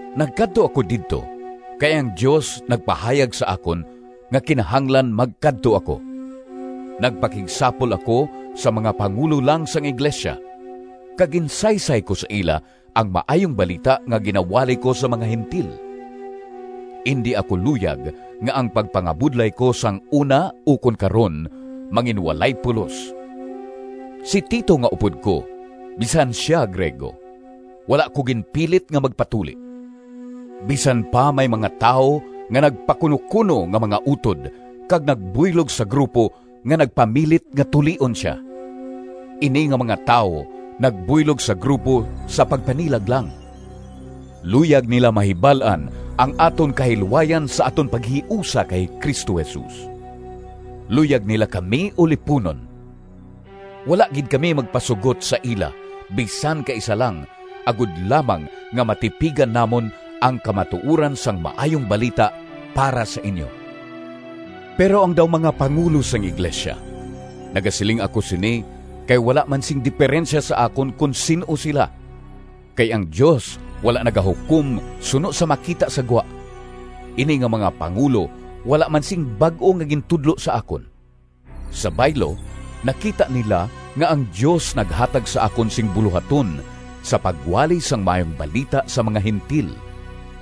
Nagkadto ako didto kay ang Dios nagpahayag sa akon nga kinahanglan magkadto ako. Nagpakigsapol ako sa mga pangulo lang sang iglesia, kag ginsaysay ko sa ila ang Maayong Balita nga ginawali ko sa mga Gentil. Indi ako luyag nga ang pagpangabudlay ko sang una ukon karon, manginwalay pulos. Si Tito nga upod ko, bisan sia Griego, wala ko ginpilit nga magpatuli, bisan pa may mga tawo nga nagpakunokuno nga mga utod kag nagbuylog sa grupo nga nagpamilit nga tulion sia. Ini nga mga tawo nagbuylog sa grupo sa pagpanilag lang. Luyag nila mahibal-an ang aton kahilwayan sa aton paghiusa kay Cristo Jesus. Luyag nila kami uliponon. Wala gid kami magpasugot sa ila bisan kaisa lang, agod lamang nga matipigan namon ang kamatuoran sang Maayong Balita para sa inyo. Pero ang daw mga pangulo sang iglesia—nagasiling ako sini kay wala man sing deperensya sa akon kon sin-o sila, kay ang Dios wala nagahukom suno sa makita sa gwa—ini nga mga pangulo wala man sing bag-o nga gintudlo sa akon. Sa baylo, nakita nila nga ang Dios naghatag sa akon sing bulohaton sa pagwali sang Maayong Balita sa mga Gentil,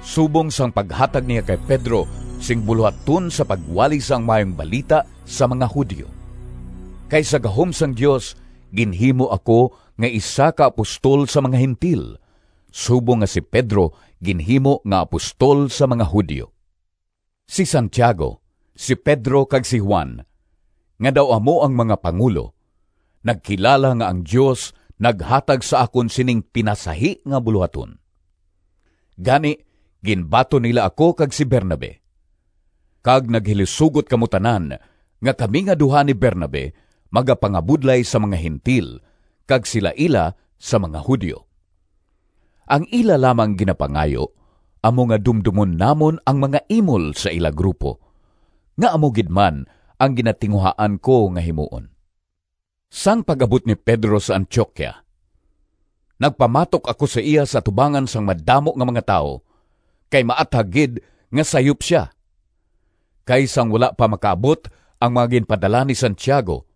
subong sang paghatag niya kay Pedro sing bulohaton sa pagwali sang Maayong Balita sa mga Judio. Kay sa gahom sang Dios ginhimo ako nga isa ka apostol sa nga Gentil subong nga si Pedro ginhimo nga apostol sa nga Judio. Si Santiago, si Pedro, kag si Juan, nga daw amo ang mga pangulo, nagkilala nga ang Dios naghatag sa akon sining pinasahi nga bulohaton. Gani ginbaton nila ako kag si Bernabe. Kag naghilisugot kamo tanan nga kami nga duha ni Bernabe magapangabudlay sa mga Gentil kag sila ila sa mga Judio. Ang ila lamang ginapangayo amo nga dumdomon namon ang mga imol sa ila grupo, nga amo gid man ang ginatinguhaan ko nga himuon. Sang pag-abot ni Pedro sa Antioquia, nagpamatok ako sa iya sa atubangan sang madamo nga mga tawo kay maathag gid nga sayop sia. Kay sang wala pa makaabot ang mga ginpadala ni Santiago,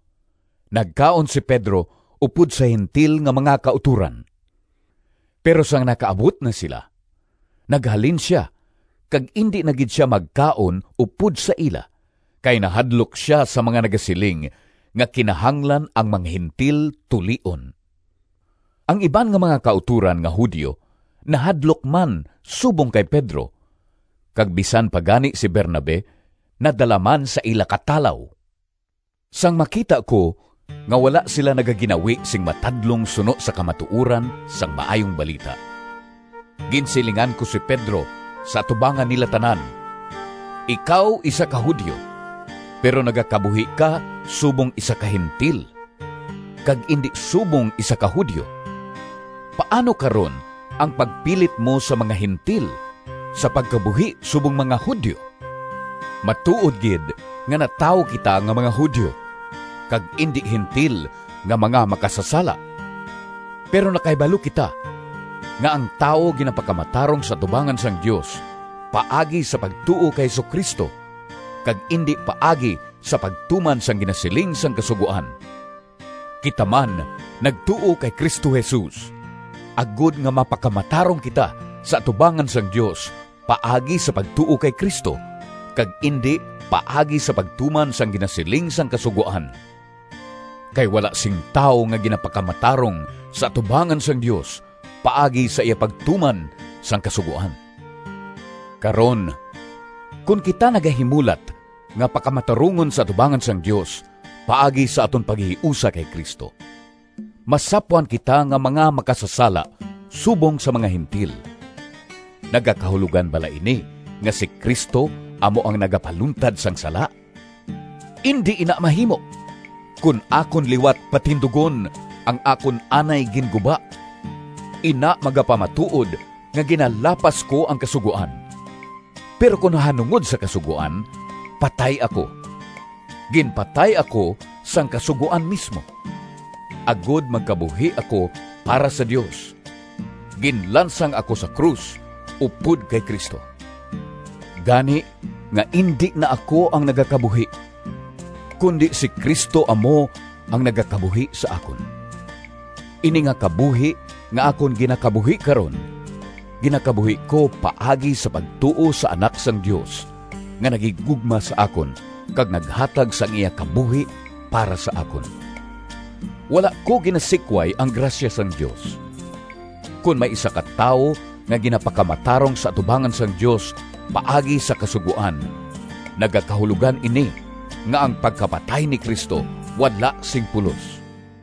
nagkaon si Pedro upod sa Gentil nga mga kautoran. Pero sang nakaabot na sila, naghalin sia kag indi na gid sia magkaon upod sa ila kay nahadlok sia sa mga nagasiling nga kinahanglan ang mga Gentil tulion. Ang iban nga mga kautoran nga Judio nahadlok man subong kay Pedro, kag bisan pa gani si Bernabe nadala man sa ila katalaw. Sang makita ko nga wala sila nagaginawi sing matadlong suno sa kamatuoran sang Maayong Balita, ginsilingan ko si Pedro sa atubangan nila tanan, “Ikaw isa ka Judio, pero nagakabuhi ka subong isa ka Gentil, kag indi subong isa ka Judio. Paano karon ang pagpilit mo sa mga Gentil sa pagkabuhi subong mga Judio?” Matuod gid nga natawo kita nga mga Judio, kag indi Gentil nga mga makasasala. Pero nakahibalo kita nga ang tawo ginapakamatarong sa atubangan sang Dios paagi sa pagtuo kay Jesu-Cristo, kag indi paagi sa pagtuman sang ginasiling sang Kasugoan. Kita man nagtuo kay Cristo Jesus, agod nga mapakamatarong kita sa atubangan sang Dios paagi sa pagtuo kay Cristo, kag indi paagi sa pagtuman sang ginasiling sang Kasugoan. Kay wala sing tawo nga ginapakamatarong sa atubangan sang Dios paagi sa iya pagtuman sang Kasugoan. Karon, kon kita nagahimulat nga pakamatarungon sa atubangan sang Dios paagi sa aton paghiusa kay Cristo, masapwan kita nga mga makasasala subong sa mga Gentil, nagakahulogan bala ini nga si Cristo amo ang nagapaluntad sang sala? Indi ina mahimo! Kon akon liwat patindugon ang akon anay ginguba, ina magapamatuod nga ginalapas ko ang Kasugoan. Pero kon nahanungod sa Kasugoan, patay ako—ginpatay ako sang Kasugoan mismo—agod magkabuhi ako para sa Dios. Ginlansang ako sa krus upod kay Cristo, gani nga indi na ako ang nagakabuhi, kundi si Cristo amo ang nagakabuhi sa akon. Ini nga kabuhi nga akon ginakabuhi karon, ginakabuhi ko paagi sa pagtuo sa Anak sang Dios, nga naghigugma sa akon kag naghatag sang iya kabuhi para sa akon. Wala ko ginasikway ang grasya sang Dios. Kon may isa ka tawo nga ginapakamatarong sa atubangan sang Dios paagi sa Kasugoan, nagakahulogan ini nga ang pagkapatay ni Cristo wala sing pulos.